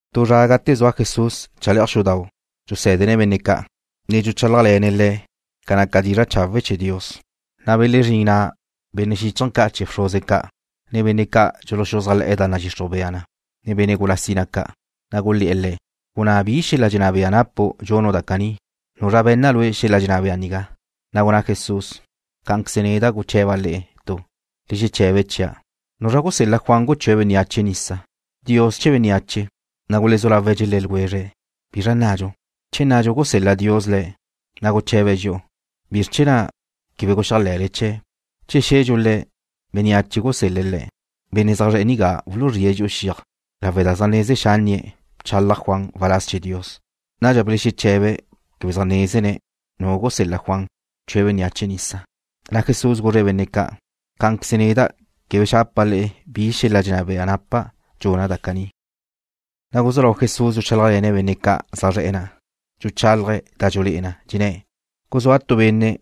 Tu zra gate zua Jesús chale'aj xudau' dxusé̱dene̱' benne' ca', ne dxuchálajle̱ne̱' le̱' ca naca dizra' chawe' chee̱ Dios, na' belezrín na' benne' xíchaje̱ ca' chee̱ bxruze ca', ne benne' ca' dxuluxuzájle̱'e̱ da nadxixruj bea na, ne benne' gula sina ca', na' gulé̱'e̱ Le̱': ―Gunná bi xel-la dxenná bea napu' dxunu' da caní. ¿Nuzra be̱nna lue' xel-la dxenná bea nigá? Na' gunná Jesús: ―Cá'anqueze neda' guche̱ba' le'e tu. Le xeche̱be chia'. ¿Nuzra gusel-la Juan guchúe̱' bénneache nisa? ¿Dios che bénneache? Na' gulezú lawe̱' dxelé̱ ljwezre̱': ―¿Bizra nnadxu? Che nnadxu gusel-la Dios le̱', na' guche̱be̱' dxi'u: “¿Bizr chee̱ na' quebe guxéajle̱le chee̱'?” Che xe̱dxu Le̱', bénneache gulesel-le̱' le̱', benne' zaj zre̱'e̱ nigá wuluzríe̱' dxi'u xiaj, lawe' da zaj neze xánnie̱' bchalaj Juan waláz chee̱ Dios. Nadxa belexeche̱be̱' quebe zaj nézene̱' nu gusel-la Juan bchue̱' bénneache nisa. Na' Jesús guzre̱' benne' ca': ―Cá'anqueze neda' quebe xapa' le'e bi xel-la dxenná bea napa' dxuna' da caní. Na' guzú lau Jesús dxuchálajle̱ne̱' benne' ca' zaj zre̱'e̱ na', dxuchálaje̱' da dxulé'e na, dxenné̱': ―Guzúa tu benne'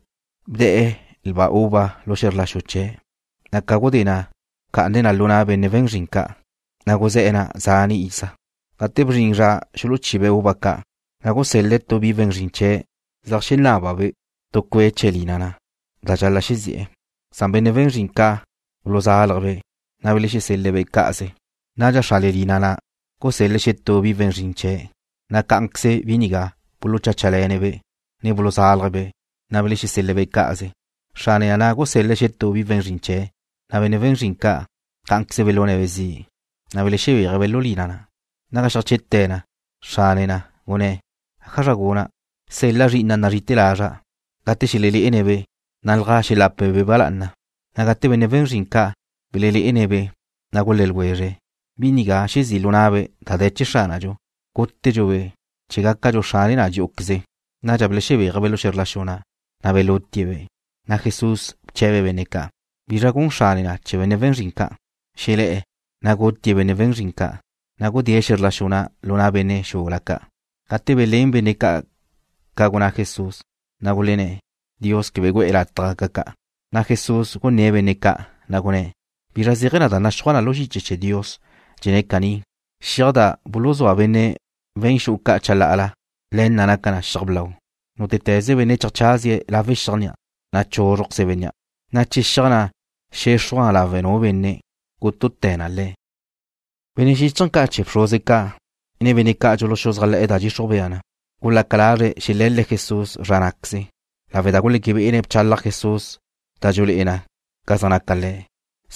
bde̱'e̱ lba uva lu xe̱zr la xu chee̱', na' ca gudé na' bca'ane̱' na lu na' benne' we̱n zrin ca', na' guzé̱'e̱ na' zane' iza. Gate bzrin zra xuluchibe̱' uva ca', na' gusel-le̱' tu bi we̱n zrin chee̱' zeajxenábabe' tu cue' chee̱ lina na' da dxal-la' xezi'e̱, san benne' we̱n zrin ca' buluzálaje̱'-be', na' belexesel-le̱'-be' cá'aze. Nadxa xrane lina na' gusél-le̱' xetú bi we̱n zrin chee̱', na' cá'anqueze bi nigá bulucháchale̱ne̱-be', ne buluzálaje̱'-be', na' belexesel-le̱'-be' cá'aze. Xrane na' gusél-le̱' xetú bi we̱n zrin chee̱', na' benne' we̱n zrin ca', cá'anqueze belune̱'-be' zi', na' belexebéaje̱'-be' lu lina na'. ’Naga xeajche'te̱ na, xrane na' gunné̱': “¿ájazra guna'? Sel-la' zri'ina' nazrí'ite̱ lazra'. Gate xelelé'ene̱'-be' nalja xelape̱'-be' ba lá'ana.” Na' gate benne' we̱n zrin ca' belelé'ene̱'-be', na' gulé̱ ljwezre̱': “Bi nigá xezí' lu na'be' da de̱ chee̱ xránadxu. Gútedxu-be', chee̱ gácadxu xrane na dxí'uqueze.” Nadxa belexebéaje̱'-be' lu xe̱zr la xu na', na' belutie̱'-be'. Nadxa Jesús bche̱be̱' benne' ca': ―¿Bizra gun xrane na' chee̱ benne' we̱n zrin ca'? Xelé̱'e̱, na' gutie̱' benne' we̱n zrin ca', na' gudée̱' xe̱zr la xu na' lu na' benne' xula ca'. Gate belén benne' ca' ca gunná Jesús, na' gulenné̱': ―Dios quebe gu'e̱ lataj gaca ca'. Na' Jesús gunné̱'e̱ benne' ca', na' gunné̱': ―¿Bizra zéaje̱ da naxúaj na lu xiche chee̱ Dios? Dxenné̱' caní: Xiaj na' da buluzúa benne' we̱n xu'u ca' chalá'ala, le̱ na' naca na xiaj blau. Nútete̱ze benne' cheajchazie̱' lawe' xiaj na', na' chúzrujqueze bénnea', na' che xiaj na' xexruj na lawe' nu benne', gútute̱ na le̱'. Benne' xíchaje̱ ca' chee̱ bxruze ca', ne benne' ca' dxuluxuzájle̱'e̱ da nadxixruj bea na gulaca lazre̱' xele̱le̱' Jesús zra ná'queze, lawe' da guleque bé'ene̱' bchalaj Jesús da dxulé'e na ca zaj naca le̱',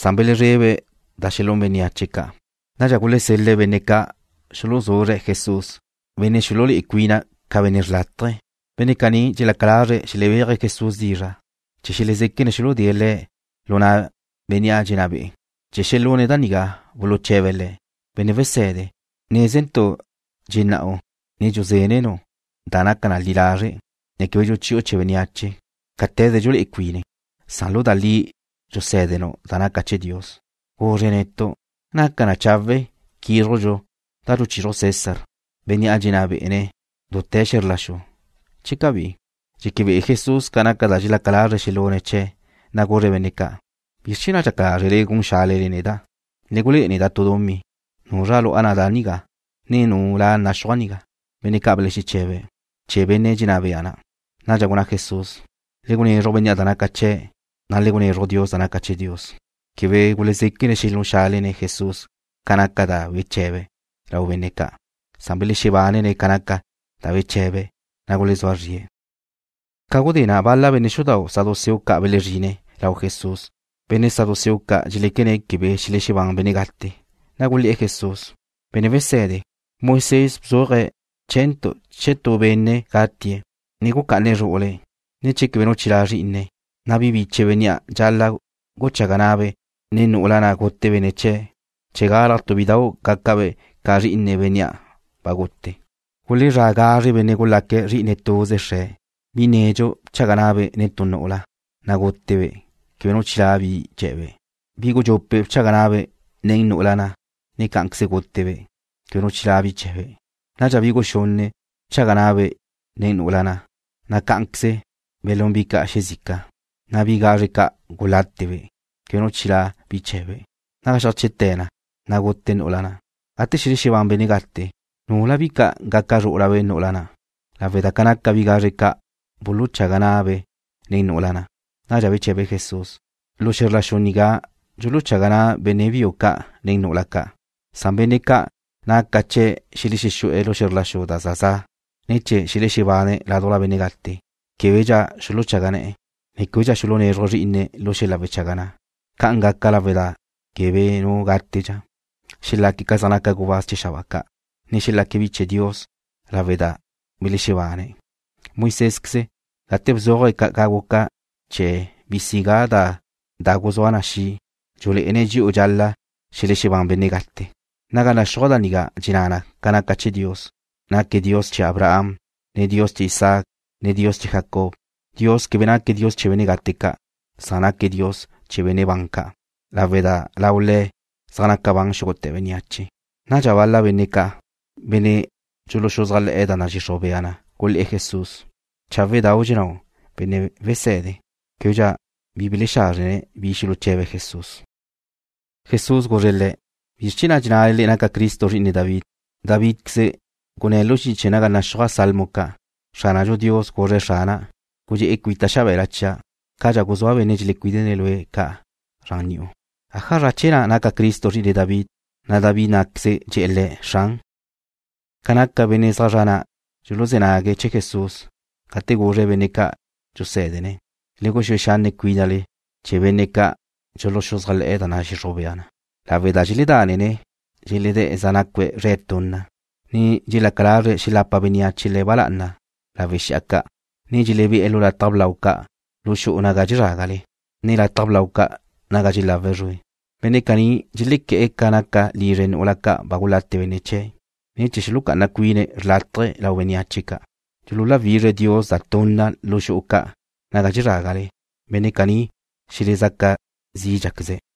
san belezrebe̱' da xelún bénneache ca'. Nadxa gulesel-le̱' benne' ca' xuluzuzre̱' Jesús, benne' xululé'e cuine̱' ca benne' xrlátaje ca'. Benne' caní dxelaca lazre̱' xelebéaje̱' Jesús dizra' chee̱ xelezéquene̱' xuludée̱' Le̱' lu na' bénnea' dxenná be'e̱. Chee̱ xelune̱' da nigá, buluche̱be̱' Le̱': ―Benne' Wese̱de, nézentu' dxennáu', ne dxusé̱denu' da naca li lazre', ne quebe dxuchi'u chee̱ bénneache cáte̱ze dxululé'e cuine̱', san lu da li dxusé̱denu' da naca chee̱ Dios. Guzre netu', ¿naca na chawe' quízrujdxu da dxuchizruj César, bénnea' dxenná bé'ene̱' dute̱ xe̱zr la xu, che cabí? Dxeque be'e Jesús ca naca da dxelaca lazre̱' xelune̱' chee̱', na' guzre̱' benne' ca': ―¿Bizr chee̱ na' dxaca lázrele gun xálele neda'? Le gulé'e neda' tu dumí. ¿Nuzra lu'a na' da na nigá, ne nu la naxúaj nigá? Benne' ca' belexeche̱be̱': ―Chee̱ benne' dxenná bea na'. Nadxa gunná Jesús: ―Le gunezruj bénnea' da naca chee̱', na' le gunezruj Dios da naca chee̱ Dios. Quebe gulezéquene̱' xelún xálene̱' Jesús ca naca da beche̱be̱' lau benne' ca'. Belexebánene̱' ca naca da beche̱be̱', na' gulezúa zrie̱'. Ca gudé na' bal-la benne' xudau' saduceo ca' belezrine̱' lau Jesús. Benne' saduceo ca' dxeléquene̱' quebe xelexebán benne' gate, na' gulé̱'e̱ Jesús: ―Benne' Wese̱de, Moisés bzúaje̱' chee̱ntu' che tu benne' gatie̱', ne gucá'ane̱' zru'ule̱', ne che quebe nu chilá' zrí'ine̱', na' bi biche bénnea' dxal-la' guchaga na'abe' nen nu'ula na' gute benne' chee̱' chee̱ galaj tu bidau' gácabe' ca zri'ine bénnea' ba gútee̱'. Gulezrá' gazre benne' gulaque̱' zri'ine tuze xre̱'. Bi nedxu bchaga na'abe' nen tu nu'ula, na' gútebe', quebe nu chilá' bi chee̱be'. Bi gudxupe' bchaga na'abe' nen nu'ula na', ne cá'anqueze gútebe' quebe nu chilá' bi chee̱be'. Nadxa bi guxunne' bchaga na'abe' nen nu'ula na', na' cá'anqueze belún bi ca' xezica, na' bi gazre ca' gulátebe' quebe nu chilá' bi chee̱be'. Naga xeajche'te̱ na, na' gute nu'ula na'. Gate xelexebán benne' gate, ¿nula bi ca' gaca zrú'ulabe' nu'ula na', lawe' da ca naca bi gazre ca' buluchaga na'abe' nen nu'ula na'? Nadxa beche̱be Jesús: ―Lu xe̱zr la xu nigá dxuluchaga na' benne' biu ca' nen nu'ula ca'. Na' benne' ca' naca chee̱' xelexexú'e̱ xe̱zr la xu da za za', ne chee̱ xelexebane̱' ládujla benne' gate, québedxa xuluchaga ne̱'e̱, ne québedxa xulunézruje̱' zrí'ine̱' lu xel-la wechaga na'. Ca'an gaca lawe' da quebe nu gátedxa na'. Xelaque̱' ca zaj naca gubáz chee̱ xabáa ca', ne xelaque̱' bi chee̱ Dios lawe' da belexebane̱'. Moisésqueze, gate bzuaje̱' ca guca chee̱ bisigá da guzúa na' xi', dxulé'ene̱' dxi'u dxal-la' xelexebán benne' gate. Naga naxúaj da nigá dxenná na ca naca chee̱ Dios, naque̱' Dios chee̱ Abraham, ne Dios chee̱ Isaac, ne Dios chee̱ Jacob. Dios quebe naque̱' Dios chee̱ benne' gate ca'. Naque̱' Dios chee̱ benne' ban ca', lawe' da lau Le̱' zaj naca ban xúgute̱ bénneache. Nadxa bal-la benne' ca', benne' dxuluxuzájle̱'e̱ da nadxixruj bea na gulé̱'e̱ Jesús: ―Cháwedau' dxennáu', Benne' Wese̱de. Québedxa belexázrjne̱' bi xuluche̱be̱' Jesús. Jesús guzre̱' le̱': ―¿Bizr chee̱ na' dxennale le'e naca Cristo zri'ine David? Davídqueze gunné̱' lu xiche naga zaj naxúaj salmo ca': Xránadxu Dios guzre̱' Xrana': “Gudxé'e cuita' xabe̱la chia', Cadxa guzúa' benne' dxelecuídene̱' lue' ca' zran ni'u.” ¿ájazra chee̱ na' naca Cristo zri'ine David, na' Davídqueze dxe̱'e̱ Le̱': “Xran”? Ca naca benne' ca' zaj zra' na' dxuluzé̱ nague̱' chee̱ Jesús gate guzre̱' benne' ca' dxusé̱dene̱': ―Le guxúe xanne' cuínale chee̱ benne' ca' dxuluxuzájle̱'e̱ da nadxixruj bea na, lawe' da dxeledánene̱' dxeledé̱' zaj nacue̱' zre̱' tunna, ne dxelaca lazre̱' xelapa bénneache le̱' ba lá'ana lawe' xi'a ca', ne dxelebé'e̱ lu lataj blau ca' lu xu'u naga dxezrágale, ne lataj blau ca' naga dxelawe̱' zrue. Benne' caní dxelequé̱'e̱ ca naca lizre nu'ula ca' ba gulate benne' chee̱', na' chee̱ xulucá'ana cuine̱' xrlátaje lau bénneache ca' dxululawízraje̱' Dios da tunna lu xu'u ca' naga dxezrágale. Benne' caní xelezaca zídxaqueze̱'.